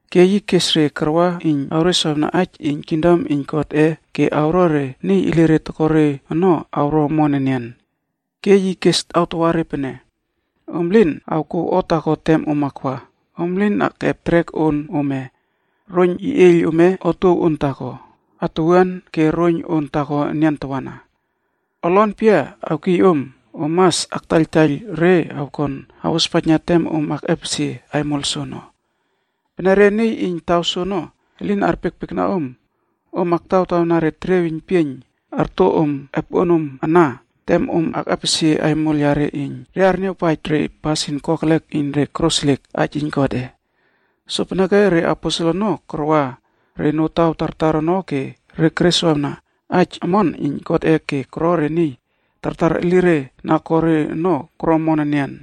Ke yi kes re karwa iyn awreswawna aij iyn kingdom iyn Godꞌe ke awro re niy elire toko re ono awro omon enian. Ke yi kes awtawa re pene, “Om lin awkouw o taako tem om akwa. Om lin akꞌep trek on ome, roiyn yeꞌieiyl ome, otuow on taako, atuwuan, ke siot taako enian tawana. Olon pia awkiy om, om mas aktaiyltaiyl re awkon awospaijna tem om akꞌepesie aimol soono. Pene re niy iyn taw soono elin arpiekpiekna om, om aktawtawna re teriey weiynpieiyn arto om epoꞌonoma ana tem om akꞌepesie aimol yare iyn re arniawpaij pene re koro pasin kokelek iyn re koroseliek aij iyn Godꞌe.” Sopeneke re aposel ono karwa re notaw tartar ono ke re kereswawna aij omon iyn Godꞌe ke koro re niy tartar elire na ko re ono koro omon enian.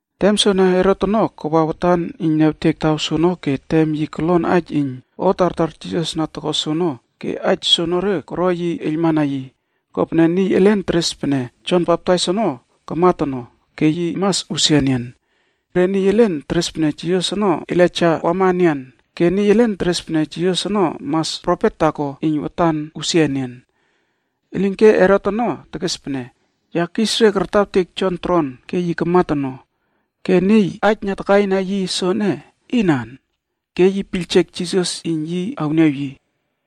Tem soene Herot ono kawa watan iyn niawtek taw soono ke tem yi kolon aij iyn o tartar Jisas na toko soono ke aij soonore koro yi eiylmana yi, kopene niy elen teres pene Jon Baptais ono kamat ono ke yi mas usia enian. Re niy elen teres pene Jisas ono Elaija wama enian ke niy elen teres pene Jisas ono mas profet taako iyn watan usia enian. Elinke Herot ono tekes pene, “Ya kis re kartawtek Jon tron ke yi kamat ono, ke niy aij na takaina yi soene, inan?” Ke yi piyljek Jisas iyn yi awniaw yi.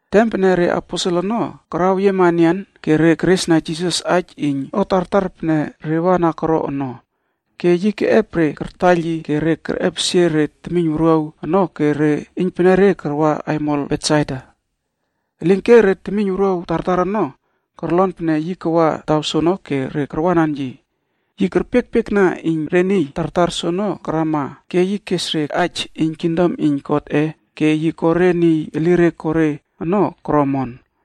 Tem pene reaposel ono karaweyiema enian ke re keresna Jisas aij iyn o tartar pene re wa na koro ono. Ke yi keꞌep re kartaiyl yi ke re kerꞌepesie re temiyn wuruaw ono ke re iynpenere karwa aimol Betsaida. Elinke re temiyn wuruaw tartar ono korlon pene yi kawa taw soono ke re karwanan yi. Yi kerpiekpiekna iyn re niy tartar soono karama ke yi kes re aij iyn kingdom iyn Godꞌe ke yi ko re niy elire ko re ono koro omon.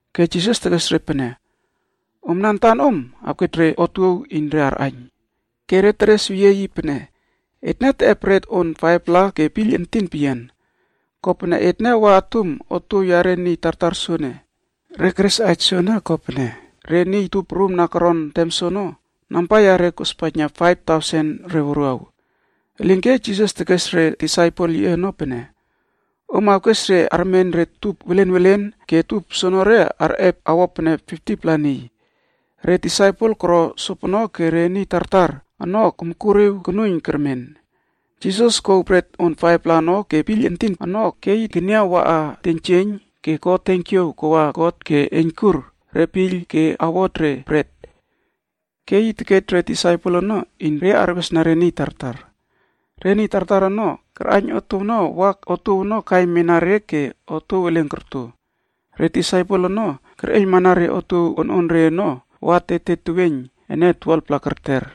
Ke Jisas tekes re pene, “Omna antanom awkej re otuow iyn re arꞌaiyn.” Ke re teres weyie yi pene, “Etne teꞌep bret on 5-pla ke piyl entin peyian. Kopene etne wa atum otuow yare niy tartar soene.” Re keres aij soene, kopene re niy tup prum na koron tem soono, namba yare kospaijna faiv tausen re wuruaw.b Elinke Jisas tekes re disaipel yiꞌe ono pene, “Om awkes re armen re tup welen welen ke tup soonore arꞌep awo pene 50-pla niy.” Re disaipel koro sopono ke re niy tartar ono komkuriw konuiyn kermen. Jisas kej lepi 5-pla ono ke piyl entin ono ke yi keniaw waꞌa teiynjieiyn ke ko tenkiaw kawa God ke eiynkur re piyl ke epak re lepi ono. Ke yi tekej re disaipel ono iyn re arwesna re niy tartar. Re niy tartar ono karꞌaiyn otuow ono wa otuow ono kaimana re ke otuow elen korto. Re disaipel ono kerꞌeiylmana re otuow ononre ono wa paiylpaiyl 12-pla kerter.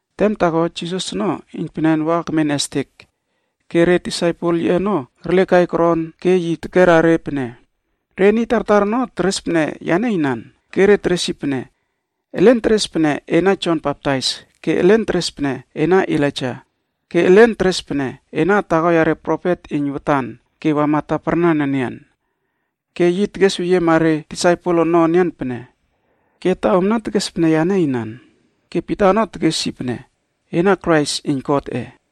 Tem taako, Jisas ono iynpenen wa kemen estek. Ke re disaipel yiꞌe ono kerlekai koron ke yi tekera re pene, “Re niy tartar ono teres pene yane inan?” Ke re teres yi pene, “Elen teres pene ena Jon Baptais, ke elen teres pene ena Elaija ke elen teres pene ena taako yare profet iyn watan ke wama taparnan enian.” Ke yi tekerweyiema re disaipel ono enian pene, “Ke ta omna tekes pene yane inan?” Ke Pita ono tekes yi pene, “Ena Krais iyn Godꞌe.”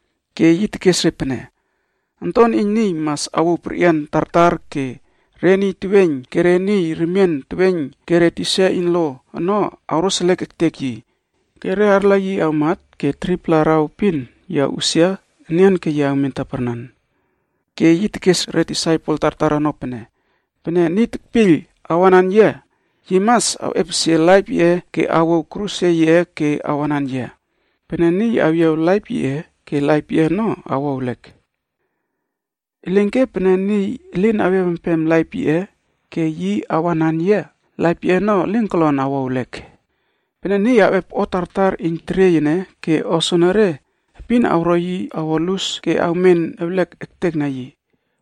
Ke yi tekes re pene, “Onton iyn Niy mas awouw perꞌian tartar ke re niy teweiyn ke re niy remien teweiyn ke re tisa iyn lo ono awroseliek ektek yi. Ke re niy arla yi awmat ke 3-pla araw epin yi awꞌusia enian ke awmen taparnan.” Ke yi tekes re disaipel tartar ono pene, “Niy tekpiyl iyn awanan yia ono mas olon amtai ektekna yi antan ke awouw kruse yiꞌe ke yi awanan yia. Pene niy awyiawtawa laip yiꞌe, laip yiꞌe ono awo ewlek. Elinke pene niy elin awyiawtawa laip yiꞌe ke awanan yia, laip yiꞌe ono awo omon peyian ke elin kolon awo ewlek. Pene niy awꞌep o tartar iyn teriey ene ke o soenere epin awro yi awo lus ke awmen ewlek ektekna yi,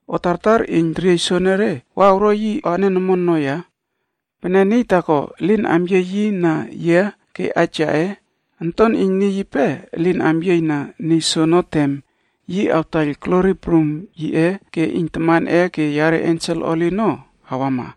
o tartar iyn teriey soenere wa awro yi anen omon ono ya? Pene niy taako elin amyiey na yia ke aij yaꞌe, Onton iyn Niy yipe elin amyiey na niy soono tem yi awtaiyl glori prum yiꞌe ke iyn Tamanꞌe ke yare ensel holi ono awama.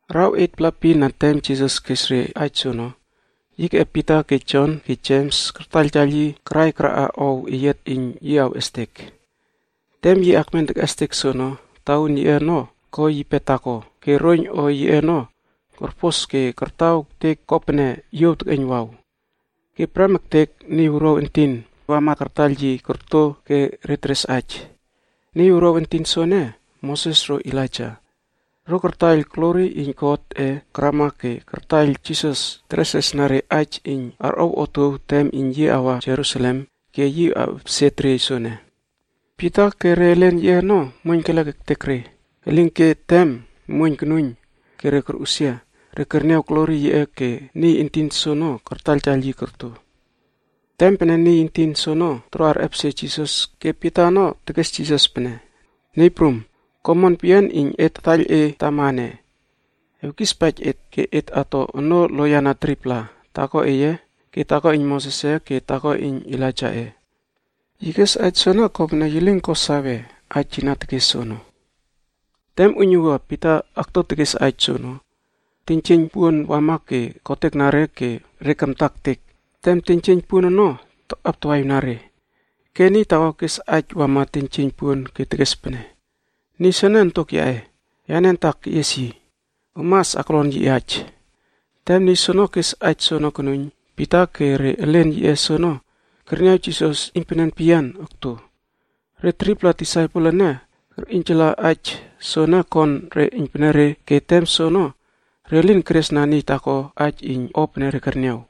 Araw 8-pla epin na tem Jisas kes re aij soono, yi keꞌep Pita ke Jon ke Jems kartaiyltaiyl yi karai karaꞌa ow eyiat iyn yi awꞌestek. Tem yi akmen tekꞌestek soono, tauun yiꞌe ono ko yipe taako ke roiyn o yiꞌe ono korpos ke kataw ektek kopene yuow tekꞌeiynwaw. Ke prem ektek, niy wuruaw entin wama kartaiyl yi korto ke re teres aij. Niy wuruaw entin soene, Moses ro Elaija. Ro kartaiyl glori iyn Godꞌe karama ke kartaiyl Jisas teresresna re aij iyn arꞌow otuow tem yi awa aimol prum Jerusalem ke yi awꞌepesie teriey ene. Pita ke re elen yiꞌe ono muoiyn teklek ektek re, elinke tem muoiyn konuiyn ke re korꞌusia, re kerniaw glori yiꞌe ke niy entin soono kartaiyltaiyl yi korto. Tem pene niy entin soono toro arꞌepesie Jisas ke Pita ono tekes Jisas pene, “Niy prum, ko omon peyian iyn et tataiyl e tama ene. Et tolon ato onoo loyiana 3-pla, taako eye, ke taako iyn Mosesꞌe ke taako iyn Elaijaꞌe.” Yi kes aij soene kopene yi lin ko sawe aij yi na tekes soono. Tem uiynuwua Pita okto tekes aij soono, tenjieiyn puon wama ke kotekna re ke re kamta ektek tem tenjieiyn puon ono takꞌaptawaꞌiwna re. Ke niy taako kes aij wama tenjieiyn puon ke tekes pene, “Niy soene Ontok yaꞌe, yane antak keꞌies yi. Om mas aklon yi aij.” Tem niy soono kes aij soono konuiyn, Pita ke re elen yiꞌe soono kerniaw Jisas iynpenen peyian okto. Re 3-pla disaipel ene kerꞌiynjala aij soene kon re iynpenere ke tem soono re lin keresna niy taako aij iyn o pene re kerniaw.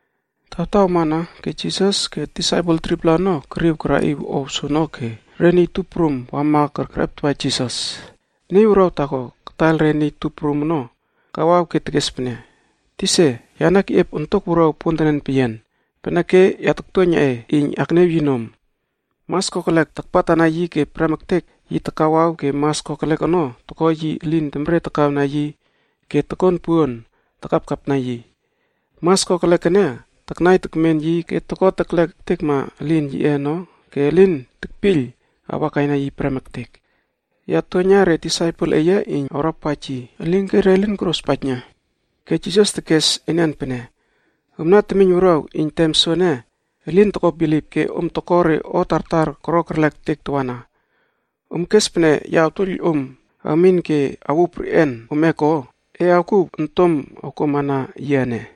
Tawtaw amana ke Jisas ke disaipel 3-pla ono keriw karaꞌiw ow soono ke re niy tup prum wama kerꞌeptawa Jisas. Niy wuruaw taako kataiyl re niy tup prum ono kawaw ke tekes pene, “Tisa, yane keꞌiep ontok wuruaw pontenen peyian, peneke ya taktuoiyna e iyn akniaw yi nom. Mas kokelek takpatana yi ke prem ektek yi takawaw ke mas kokelek ono toko yi elin temre takawna yi ke tokon puon takapkapna yi. Mas kokelek ene taknai tekmen yi ke toko teklek ektekma elin yiꞌe ono ke elin tekpiyl awakaina yi prem ektek. Ya tuoiyna re disaipel eye iyn awrawpaij yi, elinke re lin korospaijna.” Ke Jisas tekes enian pene, “Omna temiyn wuruaw iyn tem soene elin toko bilip ke om toko re o tartar koro terlek ektek tawana. Om kes pene ya awtuoiyl om awmin ke awuw perꞌian ome ko? E awkuw ontom awkuama na yia ene.”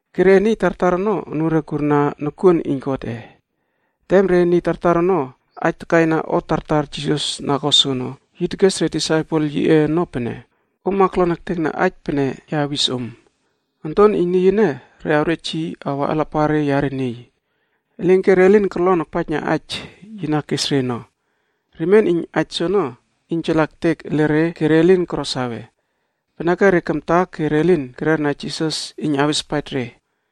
Ke re niy tartar ono anure kurna nokuon iyn Godꞌe. Tem re niy tartar ono aij takaina o tartar Jisas na ko soono, yi tekes re disaipel yiꞌe ono pene, “Om aklon ektekna aij pene ya awis om: Onton iyn Niy ene re awrej yi awa alapare yare niy.” Elinke re lin korlon akpaijna aij yi na kes re ono. Remien iyn aij soono iynjala ektek ele re ke re lin koro sawe. Peneke re kamta ke re lin kererna Jisas iyn awespaij re.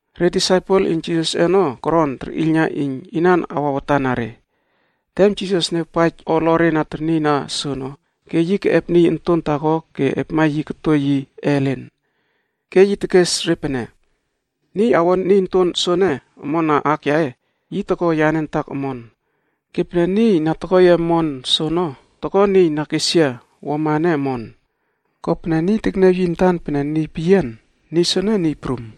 Re disaipel iyn Jisasꞌe ono koron terꞌiylna iyn inan awa watan na re. Tem Jisas niawpaij o olore na ternieyna soono, ke yi keꞌep niy onton taako ke epma yi koto yi ellen. Ke yi tekes re pene, “Niy awo niy onton soene omon na aak yaꞌe, yi toko yane antak omon. Ke pene niy na toko yia omon soono, toko niy na kes yia wuama ene omon. Kopene niy tekniaw yi antan pene niy peyian, niy soene niy prum.”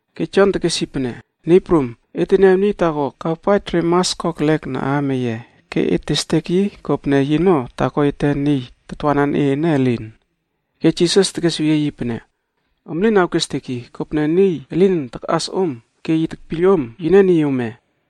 Ke Jon tekes yi pene, “Niy prum, et teniaw niy taako kawpaij re mas kokelek na aam eye ke et testek yi kopene yino taako ete niy tatwanan e ene elin.” Ke Jisas tekesweyie yi pene, “Om lin awkestek yi, kopene niy elin takꞌas om ke yi tekpiyl om, yine niy ome.”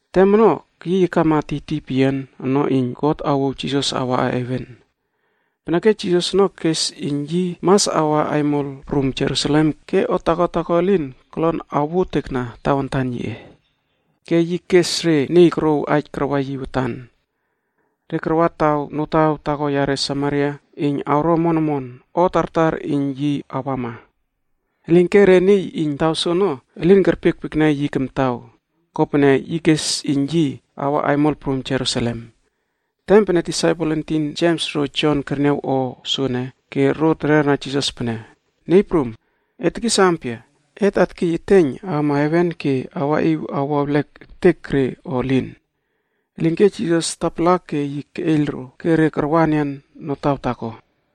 Tem ono keyiy akama tiytiy peyian ono iyn God awouw Jisas awaꞌa heven, peneke Jisas ono kes iyn yi mas awa aimol prum Jerusalem ke o taako taako elin kolon awotekna tawantan yiꞌe. Ke yi kes re niy korouw aij karwa yi watan. Re karwa taw notaw taako yare Samaria iyn awro omon omon o tartar iyn yi awama. Elinke re niy iyn taw soono elin kerpiekpiekna yi kamtaw kopene yi kes iyn yi awa aimol prum Jerusalem.c Tem pene disaipel entin Jems ro Jon kerniaw o soene, ke ro terera Jisas pene, “Niy Prum, e tekis ampia, et atkiy eteiyn awama heven ke awaꞌiw awo ewlek ektek re o elin?” Elinke Jisas tapala ke yi keꞌeiyl ro, ke re karwa enian notaw taako.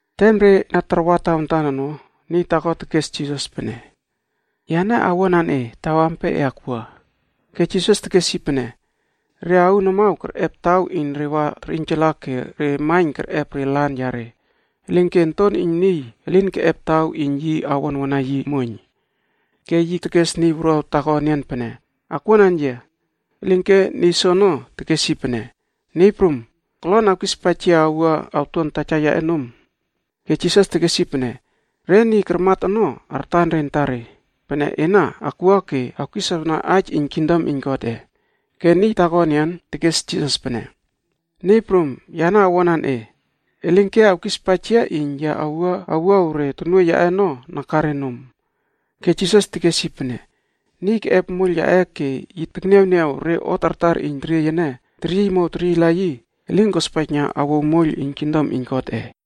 Tem re na tarwa tawantan ono, niy taako tekes Jisas pene, “Yane owuanan e taw ampia e akwua.” Ke Jisas tekes yi pene, “Re aun amaw kerꞌep taw iyn re wa terꞌiynjala ke re maiyn kerꞌep re lan yare, elinke Onton iyn Niy elin keꞌep taw iyn yi awonwona yi muoiyn.” Ke yi tekes niy wuruaw taako enian pene, “Akwuanan yia.” Elinke niy soono tekes yi pene, “Niy Prum, kolon awkispaij yia awua awtuan taja yaꞌe nom.” Ke Jisas tekes yi pene, “Re niy karmat ono artan re antare, pene ena akwua ke awkiswawna aij iyn kingdom iyn Godꞌe.” Ke niy taako enian tekes Jisas pene, “Niy Prum, yane owuanan e. Elinke awkispaij yia iyn ya awua awuaw re tonuoiy yaꞌe ono nakare nom.” Ke Jisas tekes yi pene, “Niy tekꞌep moiyl yaꞌe ke yi tekniawniaw re o tartar iyn teriey ene teryiymow teryiyla yi, elin kospaijna awouw moiyl iyn kingdom iyn Godꞌe.”